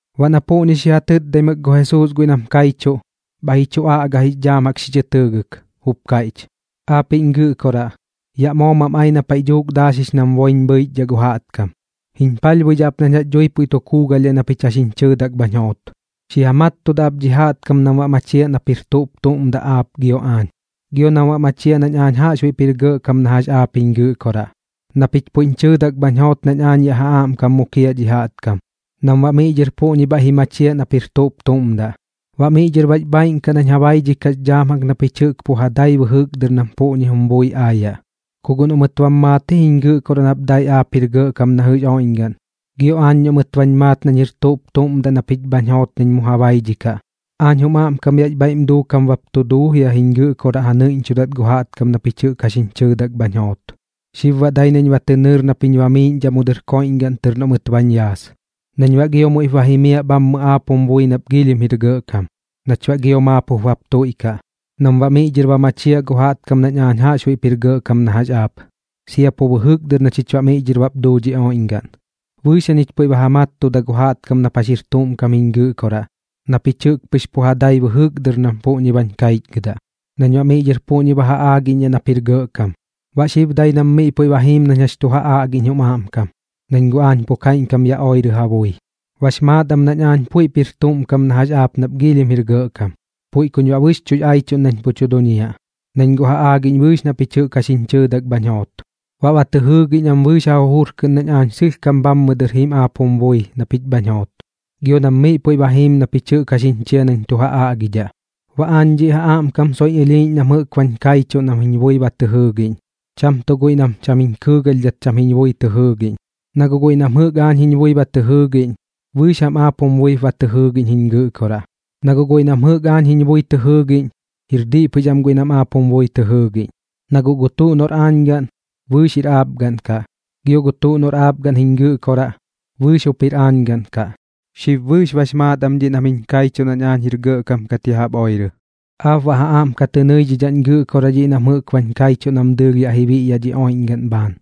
Baꞌ na puꞌñi xi ja tɨtdaimɨk gu Jesuus guiꞌ nam kaichuꞌ, bhaiꞌ ji chu aꞌga jix dhaam jaꞌk xi chɨ tɨɨgɨk, jup kaiꞌch: ―Aapiꞌñ Gɨꞌkoraꞌ, yaꞌ moo mam ai na paiꞌ dhuuk daaxix nam boiñ bhɨichdhaꞌ gu jaꞌtkam. Jiñ palhbuidhaꞌ ap nañ jax dhui puiꞌ tu kuugalhdhaꞌ na pich jax jiñ chɨɨdak bhañ joot. Xi ja mattudaꞌ ap dhi jaꞌtkam nam baꞌ machiaꞌ nap jir tuꞌp tuꞌm daꞌ aap gio aañ, gio nam machiaꞌ nañ aañ jaꞌxbuiꞌp jir gɇꞌkam na jax aap jiñ Gɨꞌkoraꞌ. Na pich puiꞌñ chɨɨdak bhañ joot nañ aañ yaꞌ ja aꞌmkam mukiaꞌ dhi jaꞌtkam, nam baꞌ miꞌ dhɨr puꞌñi bhaiꞌ ji machiaꞌ nap jir tuꞌp tuꞌm daꞌ. Baꞌ miꞌ dhɨr bax bhaaiꞌn kaꞌ nañ ja baidhikaꞌx dhaam jaꞌk na pich jɨꞌk pɨx pu ja dai bɨjɨk dɨr nam puꞌñi jum bui aayaꞌ, ku guꞌ noꞌ mɨt bam maat jiñ Gɨꞌkoraꞌ nap dai aap jir gɇꞌkam na jɨꞌx oiꞌñgaꞌn, gio aañ noꞌ mɨt bañ maat nañ jir tuꞌp tuꞌm daꞌ na pich bhañ joot nañ mu ja baidhikaꞌ. Aañ jum aꞌmkam yaꞌx bhaiꞌm duukam bap tu duu jiañ Gɨꞌkoraꞌ ja nɨiꞌñchudat gu jaꞌtkam na pich jɨꞌk jax jiñ chɨɨdak bhañ joot. Xib baꞌ dai nañ ba tɨ nɨɨr nap jiñ bamiiꞌñdhaꞌ mu dɨr koiꞌñgaꞌn tɨr noꞌ mɨt bañ yaas, nañ baꞌ gio muiꞌp ba jimiaꞌ bhammɨ aap jum bui nap giilhim jir gɇꞌkam, nach baꞌ gio maap bap tuiꞌkaꞌ, nam baꞌ miꞌ dhɨr ba machiaꞌ gu jaꞌtkam nañ aañ jaꞌxbuiꞌp jir gɇꞌkam na jax aap, sia pu bɨjɨk dɨr na chich baꞌ miꞌ dhɨr bap duu dhi oiꞌñgaꞌn. ’Bɨɨx jañich puiꞌ ba ja mattuda gu jaꞌtkam nap jax jir tuꞌm kam jiñ Gɨꞌkoraꞌ na pich jɨꞌk pɨx pu ja dai bɨjɨk dɨr nam puꞌñi bañ kaichgɨdaꞌ, nañ baꞌ miꞌ dhɨr puꞌñi ba ja aagiꞌñdhaꞌ nap jir gɇꞌkam. Baꞌ xib dai nam miꞌ puiꞌ ba jiim nañ jax tu ja aꞌgiꞌñ jum aꞌmkam, nañ guꞌ aañ pu kaiꞌñkam yaꞌ oirɨ ja bui. Bax maat am nañ aañ puiꞌp jir tuꞌm kam na jax aap nap giilhim jir gɇꞌkam, puiꞌ kuñ baꞌ bɨxchuꞌx aichuꞌn nañ pu tu duñiaꞌ. Nañ guꞌ ja aagiꞌñ bɨɨx na pich jɨꞌk jax jiñ chɨɨdak bhañ joot, baꞌ ba tɨ jɨɨgiꞌñ am bɨɨx ja jujur kɨꞌn nañ aañ sɨlhkam bhammɨ dɨr jim aap jum bui na pich bhañ joot, gio nam miꞌ puiꞌ ba jiim na pich jɨꞌk jax jiñ chia nañ tu ja aꞌgidhaꞌ. ’Baꞌ aañ dhiꞌ ja aꞌmkam soiꞌñ ɨlhiiꞌñ nam jɨꞌk bañ kaichuꞌ nam jiñ bui ba tɨ jɨɨgiꞌñ, cham tuꞌ guiꞌ nam cham jiñ kɨɨgalhdhat cham jiñ bui tɨ jɨɨgiꞌñ. Na guꞌ guiꞌ nam jɨꞌk aañ jiñ bui ba tɨ jɨɨgiꞌñ, bɨɨx jam aap jum buip tɨ jɨɨgiꞌñ jiñ Gɨꞌkoraꞌ. Na guꞌ guiꞌ nam jɨꞌk aañ jiñ bui tɨ jɨɨgiꞌñ, jir diꞌ pɨx am guiꞌ nam aap jum bui tɨ jɨɨgiꞌñ. Na guꞌ gu tuꞌ noꞌr aañ gaꞌn, bɨɨx jup jir aap gaꞌn kaꞌ, gio gu tuꞌ noꞌr aap gaꞌn jiñ Gɨꞌkoraꞌ, bɨɨx jup jir aañ gaꞌn kaꞌ. Xib bɨɨx bax maat am dhiꞌ nam jiñ kaichuꞌ nañ aañ jir gɇꞌkam kat ya jaꞌp oirɨ. ’Aap baꞌ ja aꞌm ka tɨ nɨidhidhaꞌñ Gɨꞌkoraꞌ dhiꞌ nam jɨꞌk bañ kaichuꞌ nam dɨɨlh yaꞌ ji biꞌyaꞌ dhi oiꞌñgaꞌn bhaan,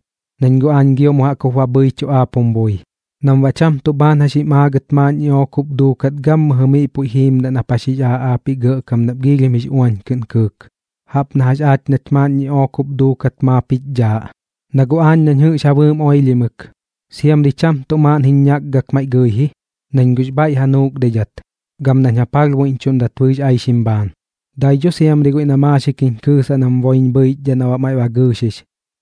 nañ guꞌ aañ gio mu jaꞌk jup ba bhɨichuꞌ aap jum bui, nam baꞌ cham tuꞌ bhaan jax jim aagat maaꞌn ñiꞌook jup duukat gammɨjɨ miꞌ puiꞌ jiimdaꞌ nap jax jix aaꞌ aapiꞌ Gɇꞌkam nap giilhim jix uañ kɨꞌn kɨɨk, jaꞌp na jax aach nach maaꞌn ñiꞌook jup duukat maap jich dhaaꞌ. Na guꞌ aañ nañ jɨꞌx ja bɨɨm oilhimɨk, siamri cham tuꞌ maaꞌn jiñ ñakgak maiꞌ gɨi ji, nañ guꞌx bhaiꞌ ja nuukdaidhat gam nañ ja palhbuiꞌñchuꞌndat bɨɨx aixim bhaan. Dai dho siamri guiꞌ na maaxik jiñ kɨɨsaꞌ nam boiñ bhɨichdhaꞌ na baꞌ maiꞌ ba gɨɨxix,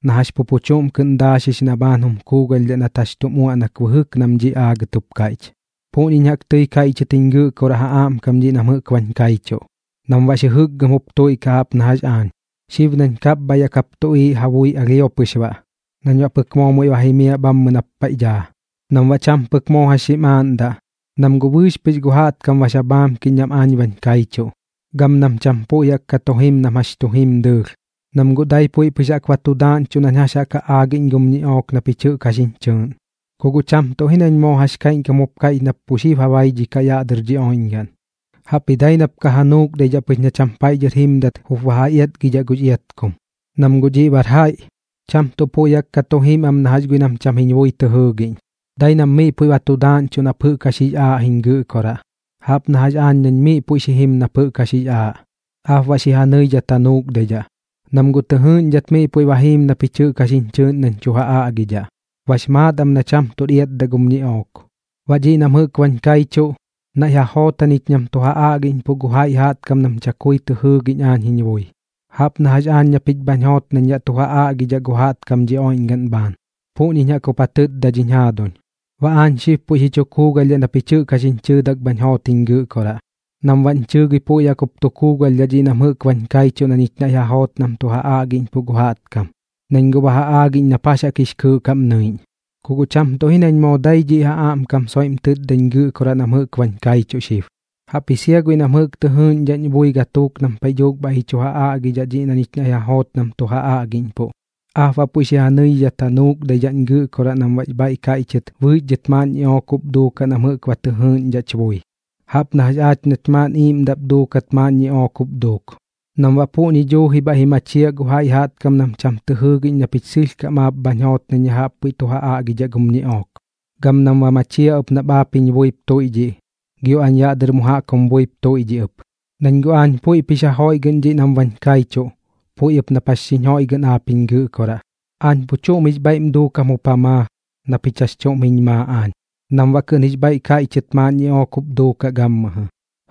na jax pu pu chuꞌm kɨꞌn daaxix na baꞌ bhaan jum kuugalhdhaꞌ nat jax tum uaꞌnak bɨjɨk nam dhiꞌ aagat jup kaiꞌch. ’Puꞌñiñ jaꞌk tɨi kaiꞌchɨt jiñ Gɨꞌkoraꞌ ja aꞌmkam dhiꞌ nam jɨꞌk bañ kaichuꞌ, nam baꞌx jɨjɨkgɨm jup tuiꞌkaꞌ jaꞌp na jax aañ, xib nañ kapbhaiꞌ yaꞌ kap tuꞌiiꞌ ja bui alhio pɨx baꞌ nañ baꞌ pɨk moo muiꞌ ba jimiaꞌ bhammɨ nap paiꞌ daa. Nam baꞌ cham pɨk moo jax xim aaꞌndaꞌ, nam guꞌ bɨɨx pɨx gu jaꞌtkam bax ja bhaamkiꞌñ nam aañ bañ kaichuꞌ, gam nam cham puiꞌ jaꞌk ka tu jim nam jax tu jim dɨɨlh, nam guꞌ dai puiꞌ pɨx jaꞌk ba tu daaꞌñchuꞌ nañ jax jaꞌk ja aagiꞌñ gum ñiꞌook na pich jɨꞌk jax jiñ chɨɨꞌn. Ku guꞌ cham tuꞌ ji nañ moo jax kaiꞌñkam jup kaiꞌch nap pu xib ba ja baidhikaꞌ yaꞌ dɨr dhi oiꞌñgaꞌn, jaꞌpji dai nap ka ja nuukdaidhaꞌ pɨx na cham paiꞌ dhɨr jimdat jup ba ja iatgidhaꞌ gux iatkum. Nam guꞌ dhiꞌ bar jaiꞌ, cham tuꞌ puiꞌ jaꞌk ka tu jim am na jax guiꞌ nam cham jiñ bui tɨ jɨɨgiꞌñ. Dai nam miꞌ puiꞌ ba tu daaꞌñchuꞌ nap jɨꞌk jax jix aaꞌ jiñ Gɨꞌkoraꞌ, jaꞌp na jax aañ nañ miꞌ puiꞌ xi jim nap jɨꞌk jax jix aaꞌ. Aap baꞌ xi ja nɨidhat ka ja nuukdaidhaꞌ, nam guꞌ tɨ jɨɨꞌñdhat miꞌ puiꞌ ba jiim na pich jɨꞌk jax jiñ chɨɨꞌn nañ tu ja aꞌgidhaꞌ, bax maat am na cham tuꞌr iatdaꞌ gum ñiꞌook. Baꞌ dhiꞌ nam jɨꞌk bañ kaichuꞌ, naiꞌ ja joot jañich nam tu ja aꞌgiꞌñpuꞌ gu jaiꞌ jaꞌtkam nam chakui tɨ jɨɨgiꞌñ aañ jiñ bui. Jaꞌp na jax aañ na pich bhañ joot nañ yaꞌ tu ja aꞌgidhaꞌ gu jaꞌtkam dhi oiꞌñgaꞌn bhaan, puꞌñiñ jaꞌk jup ja tɨtda dhiñ jaaduñ. Baꞌ aañ xib puiꞌ xi chu kuugalhdhaꞌ na pich jɨꞌk jax jiñ chɨɨdak bhañ joot jiñ Gɨꞌkoraꞌ, nam baꞌñ chɨɨgɨi puiꞌ jaꞌk jup tu kuugalhdhaꞌ dhiꞌ nam jɨꞌk bañ kaichuꞌ na ñich naiꞌ ja joot nam tu ja aꞌgiꞌñpuꞌ gu jaꞌtkam, nañ guꞌ ba ja aagiꞌñ nap jax jaꞌk jix kɨɨꞌ kaꞌm nɨiꞌñ. ’Ku guꞌ cham tuꞌ ji nañ moo dai dhiꞌ ja aꞌmkam soiꞌm tɨtdañ Gɨꞌkoraꞌ nam jɨꞌk bañ kaichuꞌ xib, jaꞌpji sia guiꞌ nam jɨꞌk tɨ jɨɨꞌñdhaꞌñ bui gatuuk nam paiꞌ dhuuk bhaiꞌ ji chu ja aꞌgidhaꞌ dhiꞌ na ñich naiꞌ ja joot nam tu ja aꞌgiꞌñpuꞌ. Aap baꞌ puiꞌ xi ja nɨidhat ja nuukdaidhaꞌñ Gɨꞌkoraꞌ nam baꞌx bhaiꞌ kaiꞌchɨt bɨɨx dhɨt maaꞌn ñiꞌook jup duukaꞌ nam jɨꞌk ba tɨ jɨɨgiꞌñdhaꞌch bui, jaꞌp na jax aach nach maaꞌn iiꞌmdaꞌp duukat maaꞌn ñiꞌook pɨx jup duuk, nam baꞌ puꞌñi duuji bhaiꞌ ji machiaꞌ gu jaiꞌ jaꞌtkam nam cham tɨ jɨɨgiꞌñ na pich sɨlhkam aap bhañ joot nañ ya jaꞌp puiꞌ tu ja aꞌgidhaꞌ gum ñiꞌook, gam nam ba machiaꞌ ɨp nap aap jiñ buip tuiꞌdhiꞌ, gio aañ yaꞌ dɨr mu jaꞌk jum buip tuiꞌdhiꞌ ɨp. Nañ guꞌ aañ puiꞌp jix ja joiꞌgɨꞌn dhiꞌ nam bañ kaichuꞌ, puiꞌ ɨp nap jax xiñ joiꞌgɨꞌn aap jiñ Gɨꞌkoraꞌ. Aañ pu chuꞌm jix bhaiꞌm duukam jup ja maa na pich jax chuꞌm jiñ maa aañ, nam baꞌ kɨꞌn jix bhaiꞌ kaiꞌchɨt maaꞌn ñiꞌook jup duukaꞌ gammɨjɨ,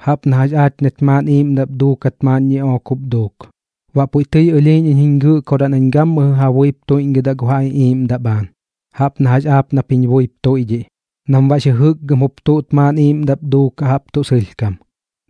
jaꞌp na jax aach nach maaꞌn iiꞌmdaꞌp duukat maaꞌn ñiꞌook jup duuk. Baꞌ puiꞌ tɨi ɨlhiiꞌñ iñ jiñ Gɨꞌkoraꞌ nañ gammɨjɨ ja buip tuiꞌñgɨdaꞌ gu ja iꞌiiꞌmdaꞌ bhaan, jaꞌp na jax aap nap jiñ buip tuiꞌdhiꞌ, nam baꞌx jɨjɨkgɨm jup tuꞌt maaꞌn iiꞌmdaꞌp duukaꞌ jaꞌp tuꞌ sɨlhkam,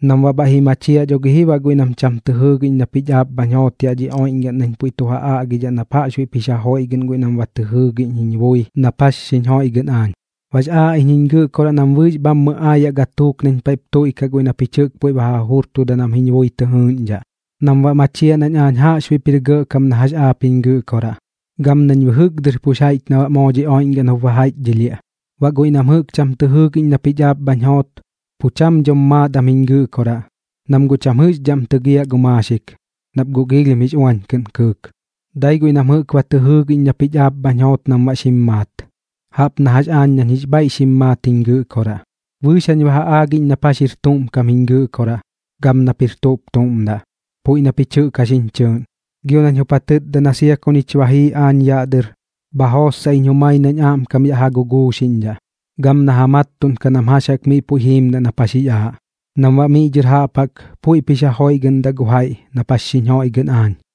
nam baꞌ bhaiꞌ ji machiaꞌ dho gi ji baꞌ guiꞌ nam cham tɨ jɨɨgiꞌñ na pich aap bhañ joot yaꞌ dhi oiꞌñgaꞌn nañ puiꞌ tu ja aꞌgidhaꞌ nap jaꞌxbuiꞌp jix ja joiꞌgɨꞌn guiꞌ nam jɨꞌk ba tɨ jɨɨgiꞌñ jiñ bui nap jax xiñ joiꞌgɨꞌn aañ. ’Baꞌx aaꞌ iñ jiñ Gɨꞌkoraꞌ nam bɨɨx bhammɨ aayaꞌ gatuuk nañ paiꞌp tuiꞌkaꞌ guiꞌ na pich jɨꞌk puiꞌ ba ja jujurtuda nam jiñ bui tɨ jɨɨꞌñdhaꞌ, nam baꞌ machiaꞌ nañ aañ jaꞌxbuiꞌp jir gɇꞌkam na jax aap jiñ Gɨꞌkoraꞌ, gam nañ bɨjɨk dɨr pux jaiꞌch na baꞌ moo dhi oiꞌñgaꞌn jup ba jaiꞌchdhɨlhiaꞌ. Baꞌ guiꞌ nam jɨꞌk cham tɨ jɨɨgiꞌñ na pich aap bhañ joot, pu cham dhom maat am jiñ Gɨꞌkoraꞌ, nam guꞌ cham jɨꞌxdhaꞌm tɨgiaꞌ gu maaxik, nap guꞌ giilhim jix uañ kɨꞌn kɨɨk. Dai guiꞌ nam jɨꞌk ba tɨ jɨɨgiꞌñ na pich aap bhañ joot nam baꞌ xim maat, jaꞌp na jax aañ nañ jix bhaiꞌ xim maat jiñ Gɨꞌkoraꞌ. Bɨɨx jañ ba ja aagiꞌñ nap jax jir tuꞌm kam jiñ Gɨꞌkoraꞌ gam nap jir tuꞌp tuꞌm daꞌ, puiꞌ na pich jɨꞌk jax jiñ chɨɨꞌn. Gio nañ jup ja tɨtda na sia ku ñich ba jii aañ yaꞌ dɨr, bha jootsaꞌ iñ jumai nañ aꞌmkam yaꞌ ja guguuxiꞌñdhaꞌ gam na ja mattuꞌnkaꞌ nam jax jaꞌk miꞌ puiꞌ jiimdaꞌ nap jax jix aaꞌ, nam baꞌ miꞌ dhɨr jaꞌp jaꞌk puiꞌp jix ja joiꞌgɨꞌndaꞌ gu jaiꞌ jaꞌp nap jax xiñ joiꞌgɨꞌn aañ.